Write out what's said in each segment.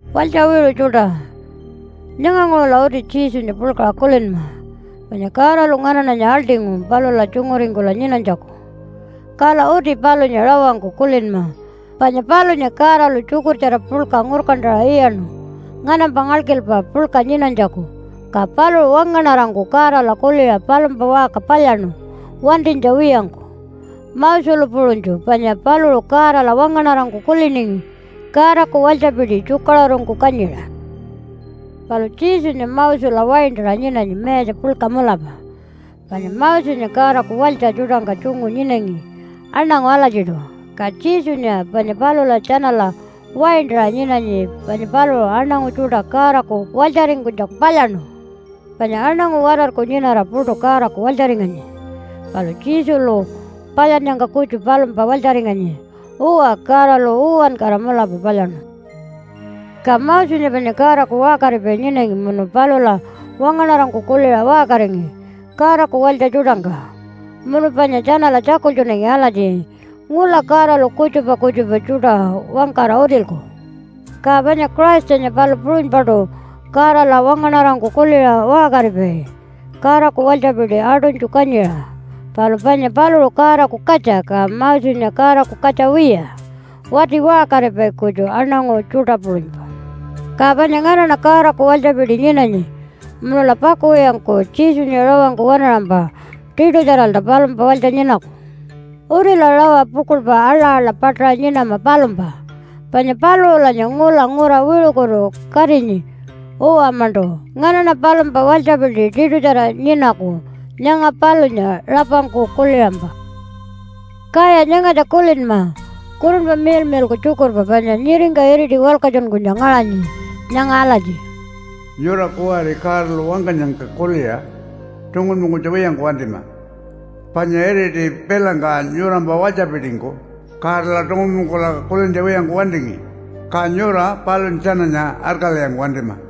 Walytja wiṟu tjuṯa, nyanganguṟula uti Jesunya puḻkaṟa kulinma, panya Godalu nganaṉanya aḻṯingu palula tjunguringkula nyinanytjaku. Kala uti palunya rawangku kulinma, panya palunya Godalu tjukurtjara puḻka ngurkantaṟa iyaṉu nganampa ngalkilpa puḻka nyinanytjaku. Ka paluṟu wangaṉarangku Godala kuliṟa palumpa waṟka palyaṉu wantinytja wiyangku Moselu puṟunytju, panya paluṟu Godala wangaṉarangku kuliningi Godaku walytjapiti tjukaṟurungku kanyiṟa. Palu Jesunya Mosela waintaṟa nyinanyi mayatja puḻka mulapa, panya Mosenya Godaku walytja tjuṯangka tjungu nyinanyi aṉangu alatjiṯu, ka Jesunya panya palula tjanala waintaṟa nyinanyi panya paluṟu aṉangu tjuṯa Godaku walytjaringkunytjaku palyaṉu. Panya aṉangu watarku nyinara puṯu Godaku walytjaringanyi, palu Jesulu palyannyangka kutju palumpa walytjaringanyi. Uwa, Godalu uwankara mulapa palyaṉu. Ka Mosenya panya Godaku waṟkaripai nyinangi munu palula wangaṉarangku kuliṟa waṟkaringi Godaku walytja tjuṯangka. Munu panya tjanala tjakultjunangi alatji, “Ngula Godalu kutjupa kutjupa tjuṯa wangkara utilku.” Ka panya Christanya palu puṟunypaṯu Godala wangaṉarangku kuliṟa waṟkaripai Godaku walytjapiti aṯunytju kanyiṟa. Palu panya paluṟu Godaku katja, ka Mosenya Godaku katja wiya wati waṟkaripai kutju aṉangu tjuṯa puṟunypa. Ka panya nganaṉa Godaku walytjapiti nyinanyi. Munula pakuwiyangku Jesunya rawangku waṉaṟampa tiṯutjaralta palumpa walytja nyinaku. Utila rawa pukuḻpa aḻa-aḻa paṯaṟa nyinama palumpa, panya paluṟulanya ngula ngura wiṟukutu katinyi. Uwa-maṉṯu nganaṉa palumpa walytjapiti tiṯutjara nyinaku nyanga palunya rapangku kuliṟampa. Kaya nyangatja kulinma Kurunpa Miḻmiḻku tjukurpa panya nyiringka iriti walkatjunkunytja ngaṟanyi nyanga alatji, “Nyura kuwari Godalu wangkanyangka kuliṟa tungunpungkunytja wiyangku wantima. Panya iriti pilangka nyurampa walytjapitingku Godala tungunpungkula kulintja wiyangku wantingi. Ka nyura palunya tjananya arkalwiyangku wantima.”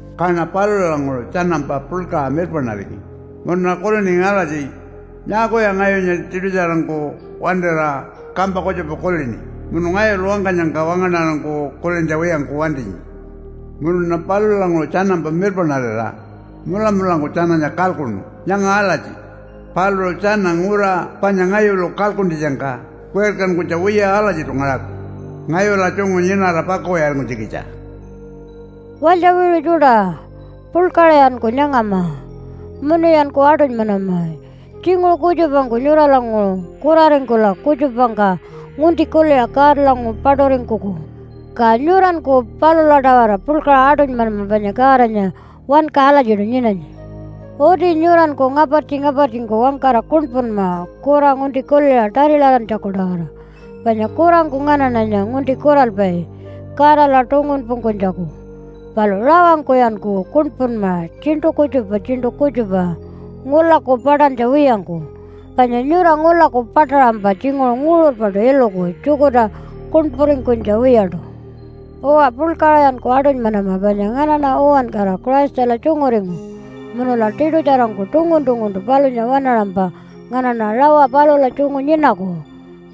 Kaṉa palulanguṟu tjanampa puḻkaṟa mirpaṉaringi munuṉa kuliningi alatji, ‘Nyaakuya ngayunya tiṯutjarangku wantira kampa kutjupa kulini munu ngayulu wangkanyangka wangaṉarangku kulintja wiyangku wantinyi?’ Munuṉa palulanguṟu tjanampa mirpaṉarira mulamulangku tjananya kalkuṉu nyanga alatji, ‘Paluṟu tjana ngura panya ngayulu kalkuntjitjangka wirkankunytja wiya alatjiṯu ngaṟaku ngayula tjungu nyinara pakuwiyaringkunytjikitja.’” Walytja wiṟu tjuṯa, puḻkaṟayanku nyangama munuyanku aṯunymanama. Tjinguṟu kutjupangku nyuralanguṟu kuraringkula kutjupangka ngunti kuliṟa Godalanguṟu paṯuringkuku, ka nyuranku palula-tawara puḻkaṟa aṯunymanama, panya Godanya wanka alatjiṯu nyinanyi. Uti nyuranku ngapartji-ngapartjingku wangkara kuṉpunma kura ngunti kuliṟa tarilarantjaku-tawara, panya kurangku nganaṉanya ngunti kuralpai Godala tungunpungkunytjaku. Palu rawangkuyanku kuṉpunma tjiṉṯu kutjupa tjiṉṯu kutjupa ngulaku paṯantja wiyangku, panya nyura ngulaku paṯaṟampa tjinguṟu nguṟurpaṯu iluku tjukurta kuṉpuringkunytja wiyaṯu. Uwa, puḻkaṟayanku aṯunymanama, panya nganaṉa uwankara Christala tjunguringu munula tiṯutjarangku tungun-tunguntu palunya waṉaṟampa nganaṉa rawa palula tjungu nyinaku.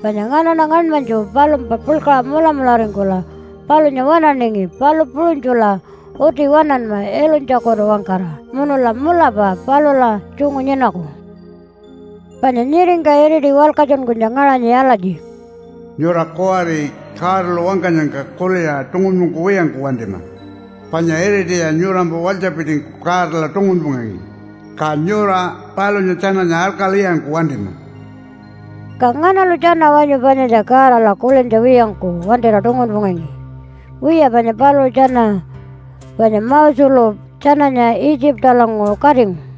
Panya nganaṉa ngaṉmanytju palumpa puḻkaṟa mulamularingkula palunya waṉaningi, palu puṟunytjula uti waṉanma ilunytjitjakutu-wangkara, munula mulapa palula tjungu nyinaku. Panya nyiringka iriti walkatjunkunytja ngaṟanyi alatji, “Nyura kuwari Godalu wangkanyangka kuliṟa tungunpungkuwiyangku wantima. Panya iritiya nyurampa walytjapitingku Godala tungunpungangi, ka nyura palunya tjananya arkalwiyangku wantima.” Ka nganalu tjana wanyu panyatja Godala kulintja wiyangku wantira tungunpungangi? Wiya panya paluṟu tjana, panya Moselu tjananya Itjipalanguṟu katingu.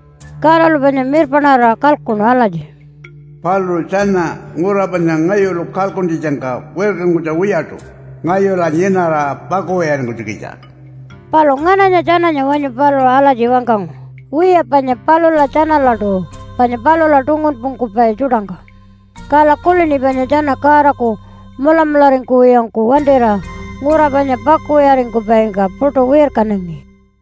Godalu panya mirpaṉarira kalkuṉu alatji, “Paluṟu tjana ngura panya ngayulu kalkuntjitjangka wirkankunytja wiyaṯu ngayula nyinara pakuwiyaringkunytjikitja.” Palu ngananya tjananya wanyu paluṟu alatji wangkangu? Wiya panya palula tjanalaṯu, panya palula tungunpungkupai tjuṯangka. Kala kulini panya tjana Godaku mulamularingkuwiyangku wantira ngura panya pakuwiyaringkupaingka puṯu wirkanangi.